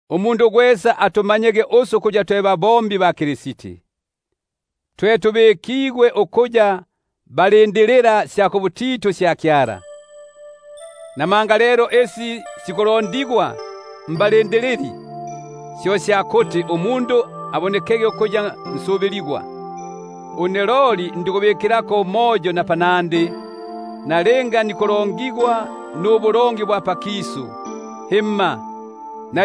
Umundu gwesa atumanyege ukuya twe babombi ba Kristi, kangi ukuya twe balindilila-sya-kubutitu sya Kyala. Bunobuno lelo isi sikulondigwa mbalindilili, syo sya kuti umundu abonekege ukuya nsubiligwa. Une loli ndikubikilako umoyo napanandi, nalinga nikulongigwa nanumwe, nalinga nikulongigwa nubulongi bwa pakisu, himma, na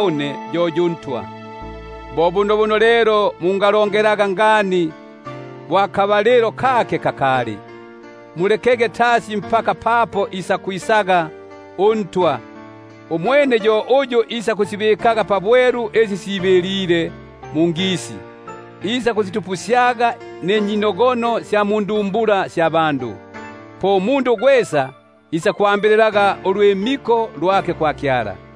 une yo yu Ntwa. Bo bunobuno lelo mungalongelaga ngani bo pakali, tasi isege uNtwa; yo uyu isakusibikaga mbwelu isi sibilile mungisi, isakusitupusyaga ninyinogono sya mundumbula; po umundu gwesa isakwambililaga ulwimiko lwake kwa Kyala.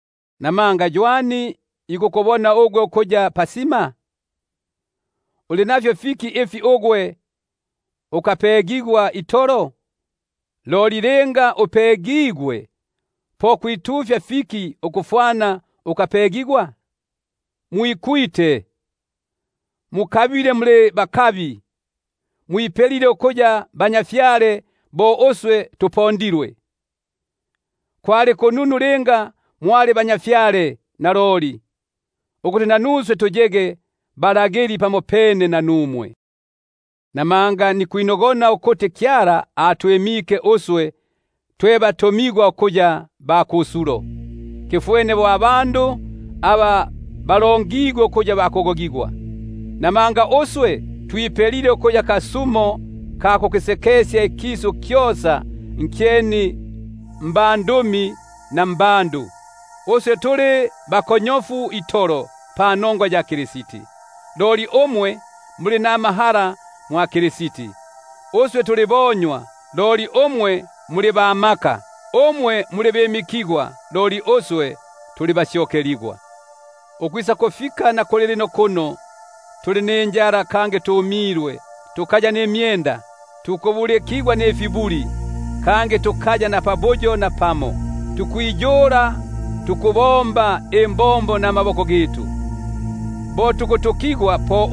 Namanga ywani akupelile ugwe ukuya pasima? Uli nafyo fiki ifi ukambilila? Loli linga gwambilile, po kwitufya fiki kufwana ukalyambilile? Mwikutile ngani, mukabile ngani; mwipelile ukuya batwa bo uswe tupondilwe. Kwali kununu linga mwalipelile batwa, ko kuti nanuswe twipelege batwa pamopene nanumwe. Namanga nikwinogona ukuti Kyala atwimike uswe twe batumigwa ukuya ba kusulo, tuliti tuli bandu ba kufwa itolo. Buno twipelile ukuya kasumo ka kukisekesya ikisu nabandumi, nabandu. Uswe tuli bakonyofu itolo panongwa ya Kristi, loli umwe muli namahala itolo mwa Kristi; uswe tuli bonywa, loli umwe muli ba maka; umwe muli bimikigwa, loli uswe tuli basyokeligwa. Ukwisakufika na kulilino kuno, tuli ninjala kangi tumilwe, kangi tukaya nifya kufwala, tukubulikigwa nifibuli, kangi tukaya napabuyo napamo; tukwiyula nikubomba imbombo namaboko gitu; apa tukutukigwa po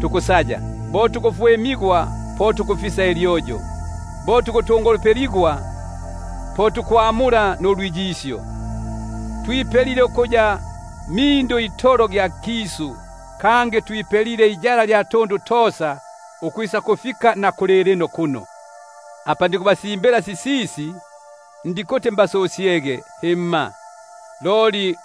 tukusaya, apa tukufwimigwa po tukufisa ilyoyo, apa tukuheluligwa, po tukutengulila; twipelile ukuya mindu itolo gya nkisu, kangi twipelile kiko kya tundu tosa ukwisakufika na kulilino kuno. Apa nikubasimbila sisisi ndikuti mbasusyege, himma, loli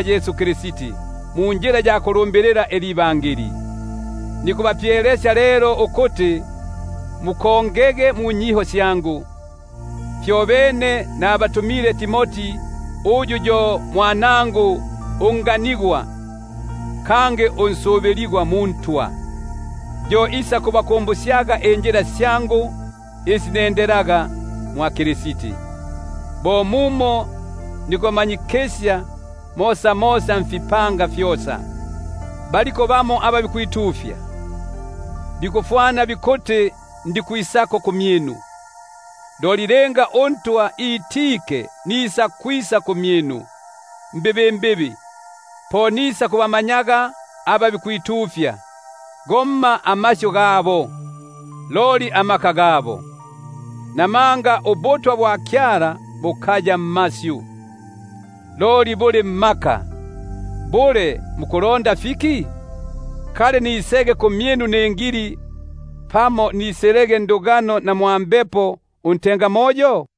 Yesu Kristi munjila ya Ibangeli. Nikubapyelesya lelo ukuti mukongege munyiho syangu. Fyobene nabatumile Timoti kumyinu, uyu yo mwanangu unganigwa kangi unsubiligwa muNtwa; yo isakubakumbusyaga injila syangu isi nendelaga mwa Kristi, bo mumo nikumanyikisya mosamosa mfipanga fyosa. Baliko bamo aba bikwitufya, bikufwana bikuti ndikwisako kumyinu; loli nisakwisa kumyinu mbibimbibi linga uNtwa itike; po nisakubamanyaga aba bikwitufya, gomma amasyu gabo, loli amaka gabo. Namanga ubutwa bwa Kyala bukaya mmasyu, loli buli mmaka. Bule mukulonda fiki? Kali nisege kumyinu ningili, pamo nisilege ndugano na mwa mbepo untengamoyo?